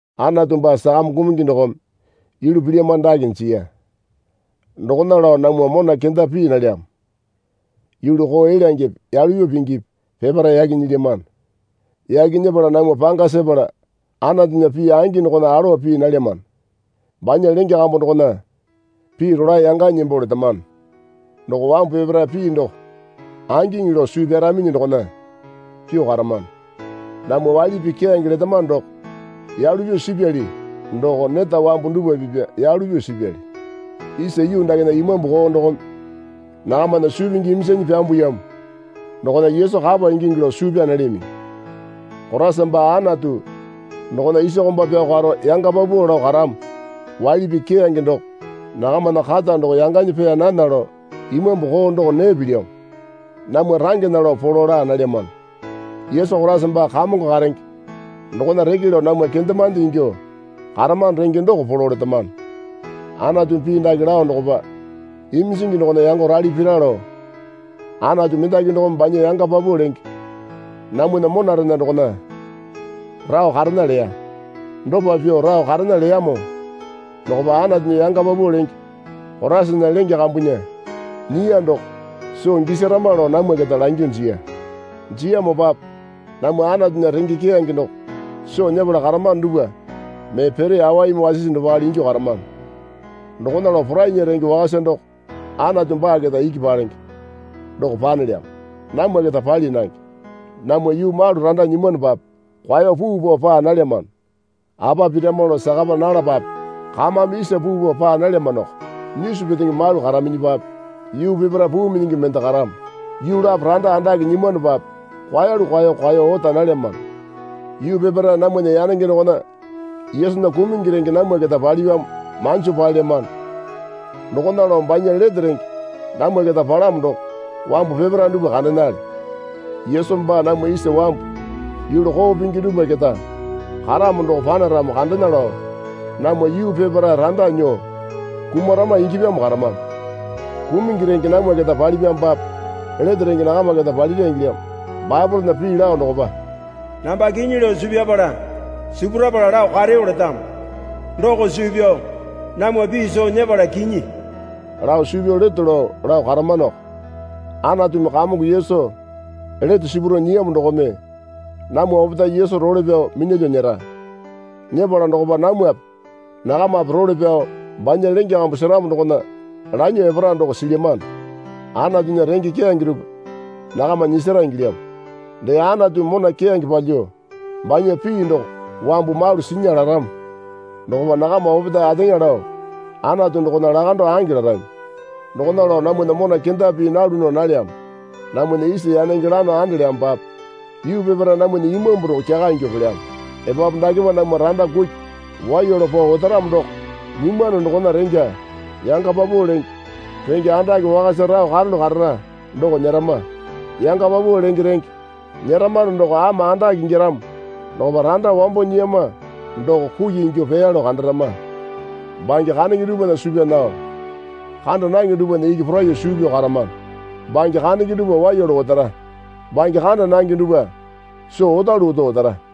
Anatu baa sakame kumungi dokome yulu pilyamano dake jiya. Dokona lao namwa mona kenda pii nalyamo. Yulu koo elyangepe yalu pyuo pingipi peparae yaki nyilyamano. Yaki nyepala namwa panga sepala Anatunya pii angi dokona alowa pii nalyamano. Banya lenge kambu dokona pii rolae yanganyi nembo letamano. Doko wambu peparae pii doko angiŋi lao suu pyaraminyi dokona pyuo karamano. Namwa waili pii keyange letamano doko yalu pyuo sipyali doko neta wambu dupwa pipa yalu pyuo sipyali. Isa yuu dakena imambu koo dokome nakamana suu pingi iminjanyi pyambuyamo dokona Yesu kapa ingingi lao suu pyaa nalyaminyi. Koraisa baa Anatu dokona isa komba pyao karo yanga paupau lao karamo waili pii keyange doko nakamana kata doko yanganyi pee nana lao imambu koo doko nee pilyamo. Namwa rangena lao polo laa nalyamano. Yesu Koraisa baa Kamongo karenge dokona reke lao namwa kendemande ingyuo karamano renge doko polo letamano. Anatumi pii dake lao dokopa, Iminjingi dokona yango rale pira lao Anatu mendaki dokome banya yanga paupau lenge namwana monarena dokona rao karena leya. Dopa pyuo rao karena leyamo dokopa Anatunya yanga paupau lenge Koraisana lenge kambunya nyiya doko soo gisarama lao namwa keta langyuo jiya. Jiyamopape namwa Anatunya renge keyange doko soo nyepala karamano dupwa mee pere awaimi wasisi dopale ingyuo karamano. Dokona lao porainya renge wakasa doko Anatu baa keta iki palenge doko panelyamo. Namwa keta pali nange. Namwa yuu malu randa nyimwanopape kwao puu pao paa nalyamano. Apa pirama lao sakapa nalapape kamame isa puu pao paa nalyamanoko. Nyisu petenge malu karaminyipape yuu peparae puu minyingi mende karamo. Yuu lapo randa andake nyimwanopape kwaelu kwaeyo kwaeyo ota nalayamano. Yuu peparae namwana yanenge dokona Yesunya kumungi renge namwa keta palipyamo manjo paelyamano. Dokona lao banya lete renge namwa keta palamo doko wambu peparae dupwa kandenale. Yesu baa namwa isa wambu yulu koo pingi dupwa keta karamo doko panaramo kandena lao namwa yuu peparae randa nyuo kumarama ingyapyamo karamano. Kumungi renge namwa keta palipyamopape lete renge nakama keta palira ingilyamo. Baepolena pii lao dokopa, Namba kinyi lao suu pyapala sipurapala lao kareyo letamo. Doko suu pyao namwa pii soo nyepala kinyi lao suu pyao leto lao lao karamanoko. Anatumi Kamongo Yesu lete sipuro nyiyamo dokome namwa opetae Yesu role pyao minyalyuo nyera. Nyepala dokopa namwape nakamape role pyao banya lenge kambu seramo dokona lanyuo epara, doko silyamano. Anatunya renge keyange dupwa nakama nyisara ingilyamo. Dee Anatumi mona keyange palyuo banya pii doko wambu malu sinya laramo dokopa nakama opetae ateŋa lao Anatu dokona lakando ange larami. Dokona lao namwana mona kenda pii nalu nao nalyamo. Namwana isa yanenge lano andelyamopape yuu peparae namwana imambu doko kyaka ingyuo pelyamo. Epapu dakepa namwa randa kuki waiya lao pao otaramo doko nyimwano dokona rengya yanga paupau lenge renge andake wakasa rao karalu karara doko nyerama. Yanga paupau lenge renge nyeramano doko ama andake ingyaramo dokopa randa wambo nyiyama doko kuki ingyuo peya lao kandarama. Bange kandenge dupwana suu pyaa nao kanda nange dupwana iki poraiyuo suu pyao karamano. Bange kandenge dupwa waiya lao otara. Bange kanda nange dupwa soo otalu oto otara.